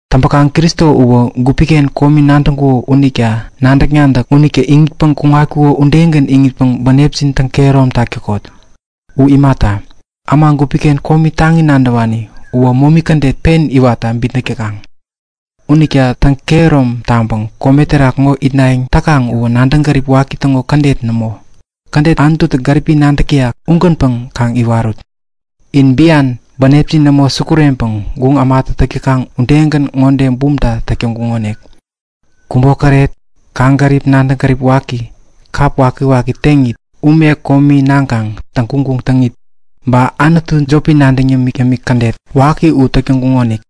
Täŋpäkaŋ Kristo uwä gupi-ken komi nadäŋkuko unita nadäk-nadäk unitä iŋitpäŋ kuŋatkuko udegän iŋitpäŋ bänepjin täŋ-kehäromtak täkot. U imata, äma gupi-ken komi taŋi nadäwani uwä momi kädet pen iwatta bitnäk täkaŋ. Unita bänepjin täŋkehärom taŋpäŋ kome terak ŋo itnayäŋ täkaŋ uwä nadäŋ gärip waki täŋo kädet nämo iwatpäŋä, kädet Anututä gäripi nadäk täyak ugänpäŋ kaŋ iwarut. In bian, bänepjin nämo sukureŋpäŋ guŋ ämatä täk täkaŋ udegän ŋode bumta täk täŋkuŋonik; Kubokäret, kaŋgärip nadäŋ gärip waki, kap wakiwaki teŋit, ume komi naŋkaŋ täŋguŋguŋ täŋit, ba anutu jopi nadäŋ yämik-yämik kädet waki u täk täŋkuŋonik.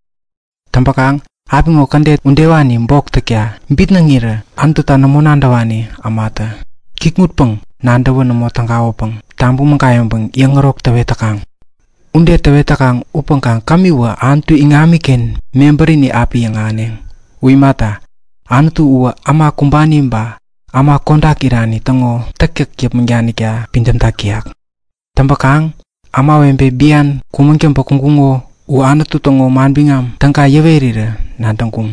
Täŋpäkaŋ apiŋo kädet udewani bok täkta bitnäŋirä Anututa nämo nadäwani ämatä kikŋutpäŋ-nadäwä nämo tägawäpäŋ tabäŋ mägayäŋpäŋ yäŋärok täwet täkaŋ. Ude täwet täkaŋ upäŋkaŋ kämiwä Anutu iŋamiken mebärini api yäŋahäneŋ. U imata, Anutu uwä äma kumbani ba äma kodak irani täŋo täktäk yäpmäŋ danikta pidämtak täyak. Täŋpäkaŋ ämawebe bian kumäŋ täŋpä kuŋkuŋo u Anutu täŋo Manbiŋam Täga yäwerirän nadäŋkuŋ.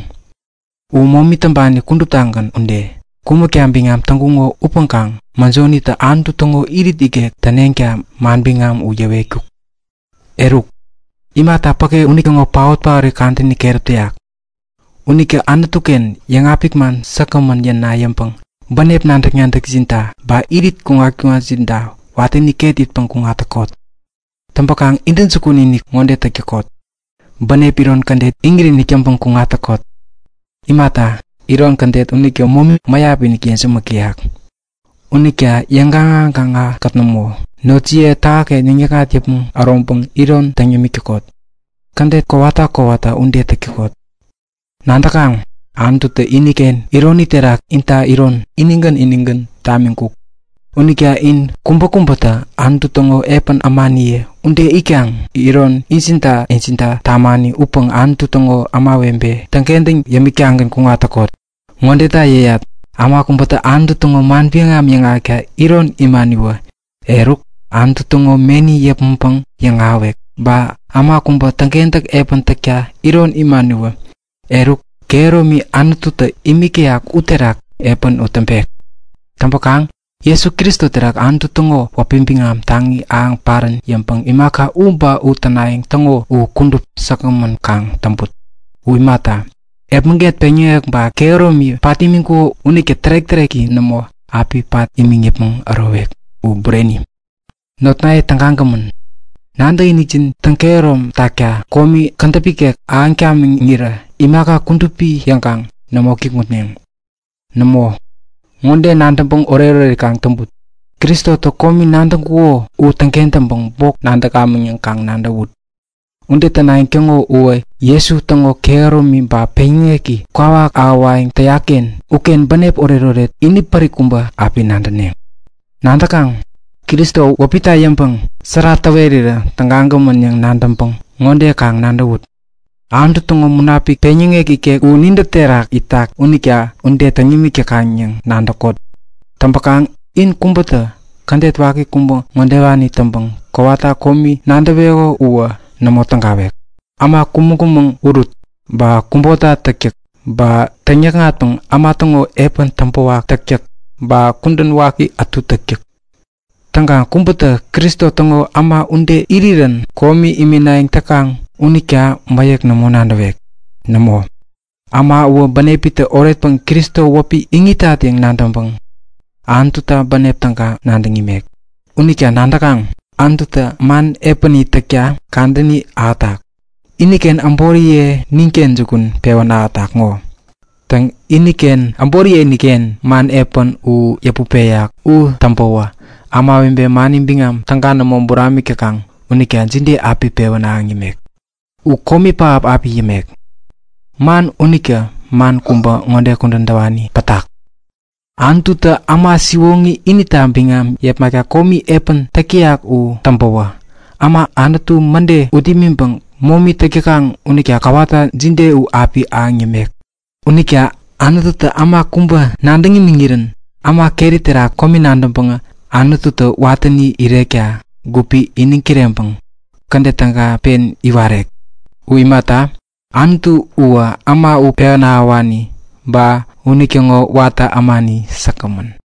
U momi täŋpani kuduptagän ude, kumäkta biŋam täŋkuŋo upäŋkaŋ mäjonitä Anutu täŋo irit ikek täneŋta manbiŋam u yäwetkuk. Eruk, imaka päke unitäŋo paotpaot kadäni keräp täyak. Unita Anutu-ken yäŋapik man säkgämän yäna yäŋpäŋ bänep nadäk-nadäkjinta, ba irit kuŋat-kuŋatjinta watäni ket itpäŋ kuŋat täkot. Täŋpäkaŋ intäjukun-inik ŋode täk täkot; Bänep iron kädet iŋit-inik täŋpäŋ kuŋat täkot. Imata, iron kädet unitä momi mäyap-inik yejämäk täyak. Unita yäŋgaŋa-gaŋakät nämo, notjiye yotjinken yäŋ-yäkŋat yäpmäŋ äroŋpäŋ iron täŋ yämik täkot. Täŋkentäk kowata kowata ude täk täkot. Nadäkaŋ, Anututä iniken ironi terak inta iron inigän inigän tamiŋkuk. Unita in kubäkubätä Anutu täŋo epän ämaniye ude itkaŋ iron injinta-injinta tamani upäŋ Anutu täŋo kudupi ämawebe täŋkentäŋ yämik-tagän yäpmäŋ kuŋat täkot. Ŋodeta yäyat; Äma kubäta Anutu täŋo manbiŋam yäŋahäkta iron imaniwä, eruk Anutu täŋo meni yäpmäŋpäŋ yäŋahäwek. Ba äma kubäta täŋkentäk epän täkta iron imaniwä, eruk, kehäromi Anututä imik täyak uterak epän u täŋpek. Täŋpäkaŋ Jesu Kristo terak Anutu täŋo wäpi biŋam taŋi ahäŋ parän yäŋpäŋ imaka u ba u tänayäŋ täŋo u kudup säkgämän kaŋ täŋput. U imata, epmäget peŋyäŋek ba kehäromi pat imiŋkuko unitä tärek-täreki nämo api pat imiŋ yäpmäŋ ärowek. U Bureni. Notnaye tägagämän, nadäkinikjin täŋkehärom takta komi kädäp ikek ahäŋ tamiŋirä imaka kudupi yäŋkaŋ nämo kikŋutneŋ. Nämo, ŋode nadäŋpäŋ oretoret kaŋ täŋput; Kristotä komi nadäŋkuko u täŋkentäŋpäŋ bok nadäkamäŋ yäŋ kaŋ nadäwut. Ude tänayäŋ täŋo uwä Jesu täŋo kehäromi ba peŋyäŋeki kwawak ahäwayäŋ täyak-ken uken bänep oretoret inipärik kubä api nadäneŋ. Nadäkaŋ, Kristo wäpita yäŋpäŋ sära täwerirä tägagämän yäŋ nadäŋpäŋ ŋode kaŋ nadäwut; Anutu täŋo Munapik, peŋyäŋek ikek u nintä terak itak unita ude täŋ nimik täkaŋ yäŋ nadäk täkot. Upäŋkaŋ in kubätä kädet waki kubä ŋodewani täŋpäŋ kowata komi nadäweko uwä nämo tägawek; Äma kumäŋ-kumäŋ urut, ba kubota täktäk, ba täŋyäkŋatpäŋ äma täŋo epän täŋpäwak täktäk ba kudän waki ätu täktäk. Täŋ, kubätä Kristo täŋo äma ude irirän komi iminayäŋ täkaŋ unita mäyäk nämo nadäwek. Nämo, äma uwä bänepitä oretpäŋ Kristo wäpi iŋitat yäŋ nadäŋpäŋ Anututa bänep täga nadäŋ imek. Unita nadäkaŋ? Anututä man epäni täkta kadäni ahätak. Iniken äboriye ninken jukun pewän ahätak ŋo. Täŋ, iniken äboriyeinik-ken man epän u yäput peyak u täŋpäwä ämawebe mani biŋam täga nämo buramik täkaŋ unita jide api pewän ahäŋ yämek? U komi pähap api yämek! Man unita man kubä ŋode kudän täwani pätak; Anututä äma siwoŋi inita biŋam yepmakta komi epän täk täyak u täŋpäwä, äma Anutu mäde ut imiŋpäŋ momi täk täkaŋ unita kowata jide u api ahäŋ yämek? Unita Anututä äma kubä nadäŋ imiŋirän äma keri terak komi nadäŋpäŋä Anututä watäni irekta gupi iniŋ kireŋpäŋ kädet täga pen iwarek. U imata, Anutu uwä äma u pewän ahäwani, ba äma unitäŋo watä ämani säkgämän.